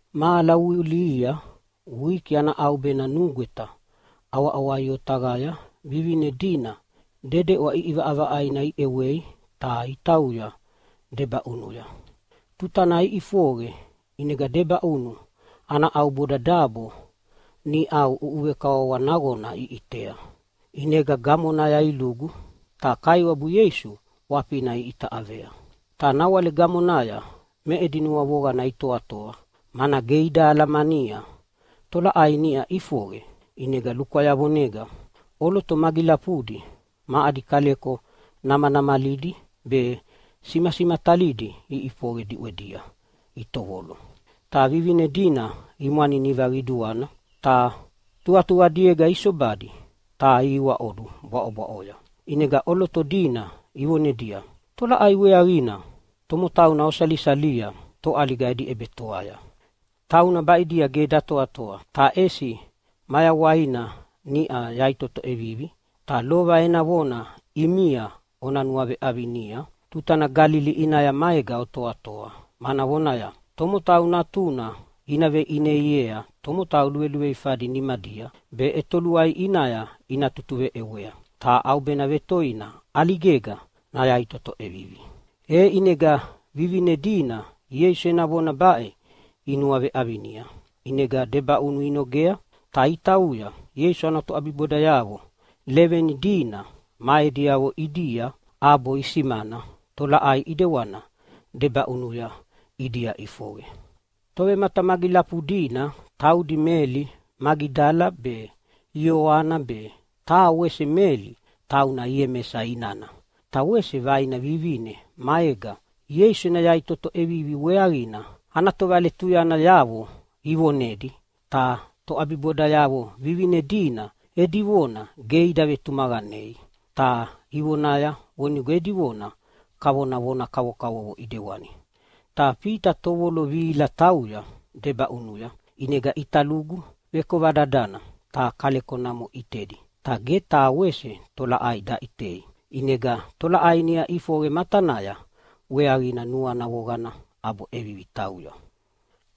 Mahala vulihia wiki ana ʼaubena nugweta ʼawaʼawai otaqaya vivine dina dedeʼwa ʼiʼivaʼavaʼaina iʼewei ta itauya debaʼunuya. Tuta nana iʼifoqe ʼinega debaʼunu ana ʼauboda dabo niʼau ʼuʼuvekawawa naqona iʼitea. ʼInega gamonaya ilugu, ta Kaiwabu Ieisu ʼwafina iʼita ʼavea. Ta nawale gamonaya me edi nuavoqana itoatoa, mana ge ida alamania tolaʼai niʼa ʼifoqe. ʼInega lukwayavonega ʼoloto magilafudi ma adi kaleko namanamalidi be simasimatalidi iʼifoqe diʼwedia itovolo. Ta vivine dina imwaniniva qiduana ta tuqatuqadiega isobadi ta ihiwaʼodu bwaʼobwaʼoya. ʼInega ʼoloto dina ivonedia, “Tolaʼai weaqina tomotauna osalisalia toʼaliga edi ʼebetoaya? Tauna baʼidia ge datoatoa, ta ʼesi mayawaina niʼa yaʼitoto ʼevivi. Ta lova ena vona ʼimia ona nuaveʼavinia tutana Galili ʼinaya maega otoatoa, mana vonaya, ‘Tomotau Natuna ina veʼineiea tomotau luveluveifadi nimadia be ʼetoluai ʼinaya ina tutuveʼewea, ta ʼaubena vetoina ʼaligega nayaʼitoto ʼevivi.’” E ʼinega vivine dina Ieisu ena vona baʼe inuaveʼavinia. ʼInega debaʼunu inogea ta itauya Ieisu ana toʼabibodayavo leveni dina ma ediavo ʼidia, ʼabo isimana tolaʼai ʼidewana debaʼunuya ʼidia ʼifoqe. Tovematamagilafu dina taudi Meli Magidala be Ioana be taha wese Meli, tauna Iemesa inana, ta wese vaina vivine maega Ieisu ena yaʼitoto ʼevivi weaqina ana tovaletuyanayavo ivonedi. Ta toʼabibodayavo vivine dina edi vona ge ida vetumaqanei, ta ivonaya vonigo edi vona kavona vona kavokavovo ʼidewani. Ta Fita tovolo vihila tauya debaʼunuya ʼinega ʼita lugu vekova dadana ta kaleko namo ʼitedi ta ge taha wese tolaʼai daʼitei. ʼInega tolaʼai niʼau ʼifoqe matanaya weaqina nuana voqana ʼabo ʼevivi tauya.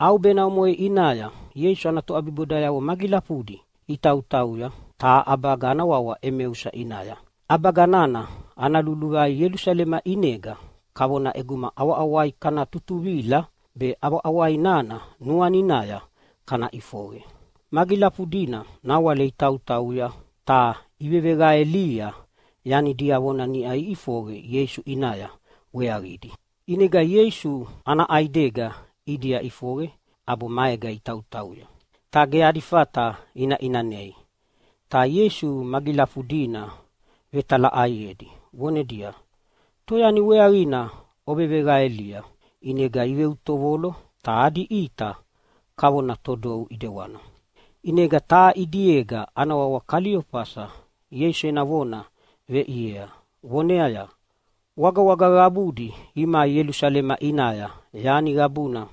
ʼAubena omoʼe ʼinaya Ieisu ana toʼabibodayavo magilafudi itautauya taha ʼabaga ana wawa Emausa ʼinaya. ʼAbaga nana ana luluvai Ielusalema ʼinega kavona ʼeguma ʼawaʼawaia kana tutuvila be ʼawaʼawai nana nuaninaya kana ʼifoqe. Magilafudina nawale itautauya ta iveveqaelia yani diavona niʼa ʼifoqe Ieisu ʼinaya weaqina. ʼInega Ieisu ana ʼaidega ʼidia ʼifoqe ʼabo maega itautauya, ta ge adi fata ina ʼinanei. Ta Ieisu magilafudina vetalaʼaiedi vonedia, “Toyani weaqina oveveqaelia?” ʼInega iveutovolo ta adi ʼita kavona todou ʼidewana. ʼInega taha ʼidiega ana wawa Kaliofasa Ieisu ena vona veʼiea voneaya, “Wagawaga qabudi imai Ielusalema ʼinaya yani qabuna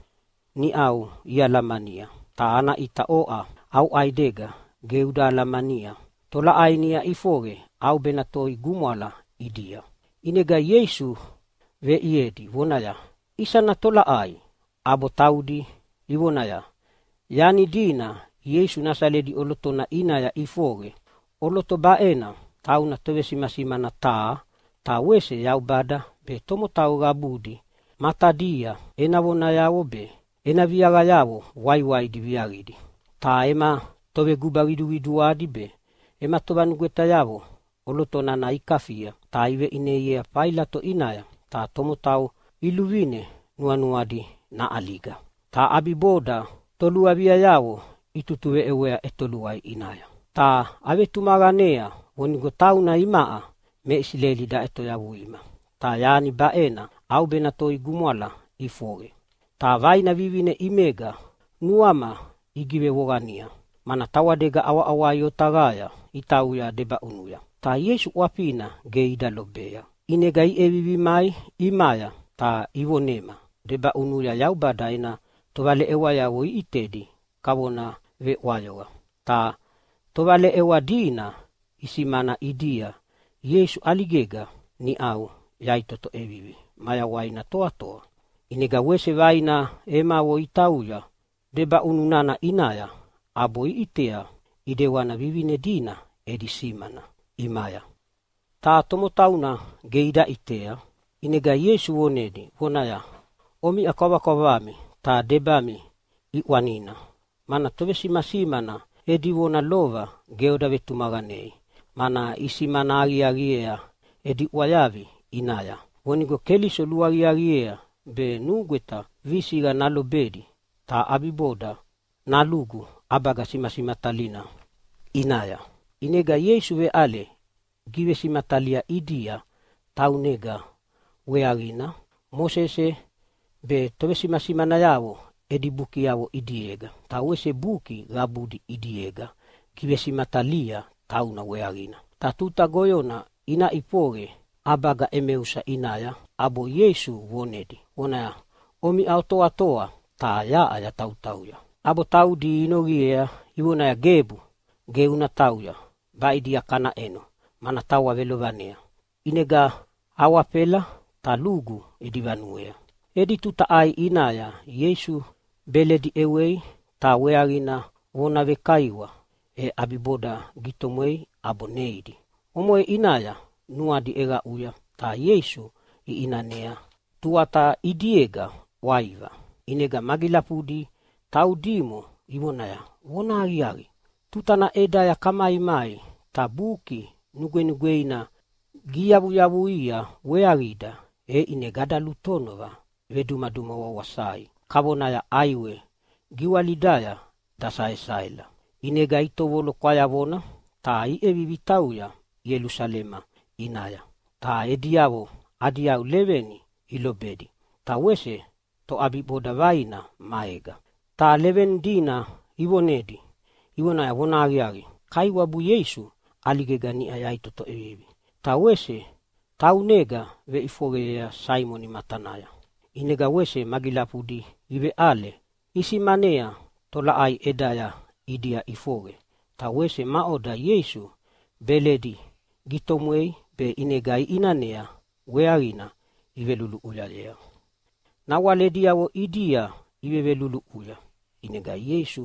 niʼau ialamania, ta ana ʼita oʼa au ʼaidega ge uda alamania tolaʼai niʼa ʼifoqe ʼaubena toi gumwala ʼidia?” ʼInega Ieisu veʼiedi vonaya, “Isana tolaʼaia?” ʼAbo taudi ivonaya, “Yani dina Ieisu Nasaleta ʼolotona ʼinaya ʼifoqe. ʼOloto baʼena tauna tovesimasimana taha, ta wese Yaubada be tomotau qabudi matadia ena vonayavo be ena viaqayavo waiwaidi viaqidi. Ta ema toveguba qiduqiduadi be ema tovanugwetayavo ʼoloto nana ikafia ta iveʼineiea Failato ʼinaya, ta tomotau iluvine nuanuadi naʼaliga. Ta ʼabiboda toluaviayavo itutuveʼewea ʼetoluai ʼinaya. Ta avetumaqanea vonigo tauna imaʼa me Isileli daʼetoyavuima, ta yani baʼena ʼaubena toi gumwala ʼifoqe. “Ta vaina vivine ʼimega nuama igivevoqania, mana tawadega ʼawaʼawai otaqaya itauya debaʼunuya, ta Ieisu ʼwafina ge ida lobei. ʼInega iʼevivi imai ʼimaya ta ivonema debaʼunuya Yaubada ena tovaleʼewayavo iʼitedi kavona veʼwayoqa. Ta tovaleʼewa dina isimana ʼidia Ieisuna ʼaligega niʼau yaʼitoto ʼevivi mayawaina toatoa. ʼInega wese vaina emavo itauya debaʼunu nana ʼinaya ʼabo iʼitea ʼidewana vivine dina edi simana ʼimaya, ta tomotauna ge ida ʼitea.” ʼInega Ieisu vonedi vonaya, “Omiʼa kwavakwavami ta debami ʼiʼwanina, mana tovesimasimana edi vona lova ge oda vetumaqanei. Mana isimana aqiaqi edi ʼwayavi ʼinaya vonigo Keliso luaqiaqiea be nugweta visiqa nalobedi ta ʼabiboda nalugu ʼabaga simasimatalina ʼinaya.” ʼInega Ieisu veʼale givesimatalia ʼidia taunega weaqina Mosese be tovesimasimanayavo edi bukiavo ʼidiega, ta wese buki qabudi ʼidiega givesimatalia tauna weaqina. Ta tuta goyona ina ʼifoqe ʼabaga Emausa ʼinaya, ʼabo Ieisu vonedi vonaya, “Omiʼa otoatoa, ta yaʼa yatautauya.” ʼAbo taudi inoqiea ivonaya, “Gebu, ge una tauya, baʼidia kana ʼeno, mana tawa velovanea.” ʼInega awafela ta lugu edi vanuea. Edi tuta ʼai ʼinaya Ieisu beledi ʼewei ta weaqina vona lukaiwa, e ʼabiboda gitomwea ʼabo neidi. Omoʼe ʼinaya nuadi ʼeqaʼuya ta Ieisu iʼinanea, tuata ʼidiega ʼwaiva. ʼInega magilafudi taudimo ivonaya, “Vonahaqiaqi, tutana ʼedaya kamaimai ta Buki Nugwenugweina giyavuyavuia weaqida e ʼinega ada lutonova vedumaduma wawasai kavonaya ʼaiwe giwalidaya dasaesaela.” ʼInega itovolo kwayavona ta iʼevivi itauya Ielusalema ʼinaya ta ediavo adi yau leveni ilobedi ta wese toʼabiboda vaina maega. Ta leveni dina ivonedi ivonaya, “Vonahaqiaqi, Kaiwabu Ieisu ʼaligega niʼa yaʼitoto ʼevivi, ta wese taunega veʼifoqeyea Saimoni matanaya.” ʼInega wese magilafudi iveʼale isimanea tolaʼai ʼedaya ʼidia ʼifoqe, ta wese maʼoda Ieisu beledi gitomwei be ʼinega iʼinanea weaqina iveluluʼuyayea. Nawale ediavo ʼidia iveveluluʼuya ʼinega Ieisu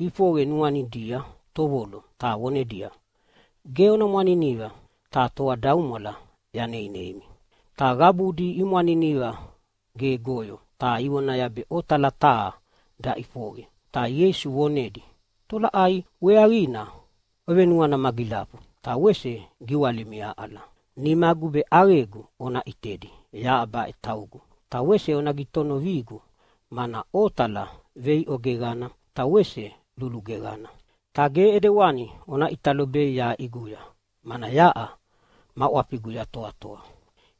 ʼifoqe nuanidia tovolo ta vonedia, “Ge ona mwaniniva ta toadaumwala yaneineimi!” Ta qabudi imwaniniva gegoyo ta ivonaya be otala taha daʼifoqe. Ta Ieisu vonedia, “Tolaʼai weaqina ovenuana magilafu ta wese giwalimi aʼala? Nimagu be ʼaqegu ona ʼitedi, yaʼa baʼe taugu. Ta wese ona gitonovigu mana otala veiʼo geqana ta wese lulu geqana, ta ge ʼedewani ona ʼita lobei yaʼa ʼiguya, mana yaʼa ma ʼwafigu yatoatoa.”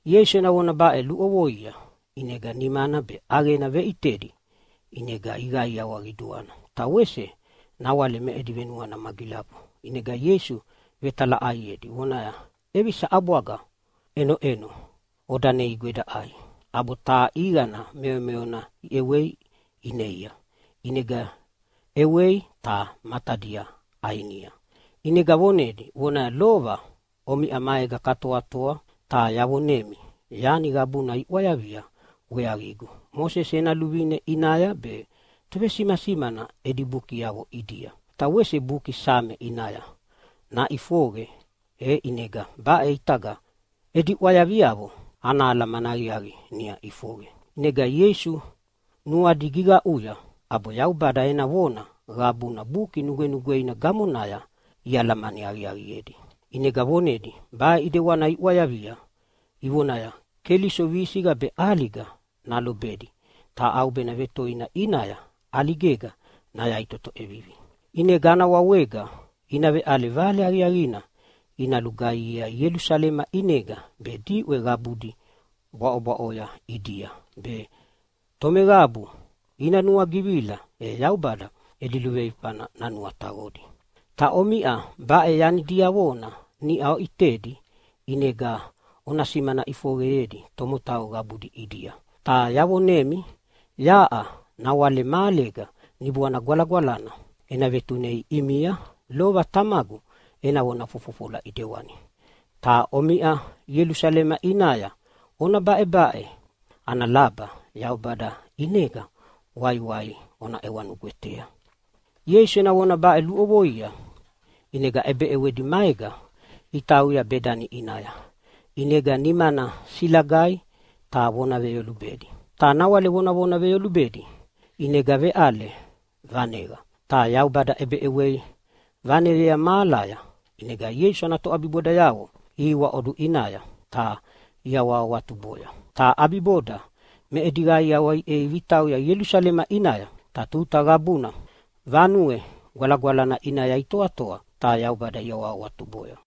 Ieisu ena vona baʼe luʼovoia, ʼinega nimana be ʼaqena veʼitedi. ʼInega iqaiawa qiduana ta wese nawale me edi venuana magilafu, ʼinega Ieisu vetalaʼaiedi vonaya, “ʼEvisa ʼabwaga ʼenoʼeno oda neigu eda ʼai?” ʼAbo taha ʼiqana meomeona iʼewei ineia. ʼInega ʼewei ta matadia ʼainia. ʼInega vonedi vonaya, “Lova omiʼa maega katoatoa ta yavonemi yani qabuna iʼwayavia weaqigu Mosese ena luvine ʼinaya be tovesimasimana edi bukiavo ʼidia ta wese buki Same ʼinaya naʼifoqe. E ʼinega baʼe ʼitaga edi ʼwayaviavo ana alamani aqiaqi niʼa ʼifoqe.” ʼInega Ieisu nuadi giqaʼuya ʼabo Yaubada ena vona qabuna Buki Nugwenugweina gamonaya ialamani aqiaqiedi. ʼInega vonedia, “Baʼe ʼedewani iʼwayavia ivonaya, ‘Keliso visiqa be ʼaliga nalobedi, ta ʼaubena vetoina ʼinaya ʼaligega nayaʼitoto ʼevivi, ʼinega ana wawega ina veʼale Vale Aqiaqina ina lugaihiea Ielusalema ʼinega be diʼwe qabudi bwaʼobwaʼoya ʼidia, be tomeqabu ina nuagivila e Yaubada edi luveifana nanuataqodi.’ Ta omiʼa baʼe yani diavona niʼa oʼitedi, ʼinega ona simana ʼifoqeyedi tomotau qabudi ʼidia. Ta yavonemi, yaʼa nawale mahalega Niboana Gwalagwalana ena vetunei ʼimia, lova Tamagu ena vona fofofola ʼidewani. Ta omiʼa Ielusalema ʼinaya ona baʼebaʼe ana laba Yaubada ʼinega waiwai ona ʼewa nugwetea.” Ieisu ena vona baʼe luʼovoia ʼinega ʼebeʼewedi maega itauya Bedani ʼinaya. ʼInega nimana silagaia ta vona veyolubedi. Ta nawale vonavona veyolubedi ʼinega veʼale vaneqa ta Yaubada ʼebeʼewei vaneyea mahalaya. ʼInega Ieisu ana toʼabibodayavo ihiwaʼodu ʼinaya ta iawahawatuboya, ta ʼabiboda me edi qaiawa iʼevivi itauya Ielusalema ʼinaya. Ta tuta qabuna Vanue Gwalagwalana ʼinaya itoatoa ta Yaubada iawahawatuboya.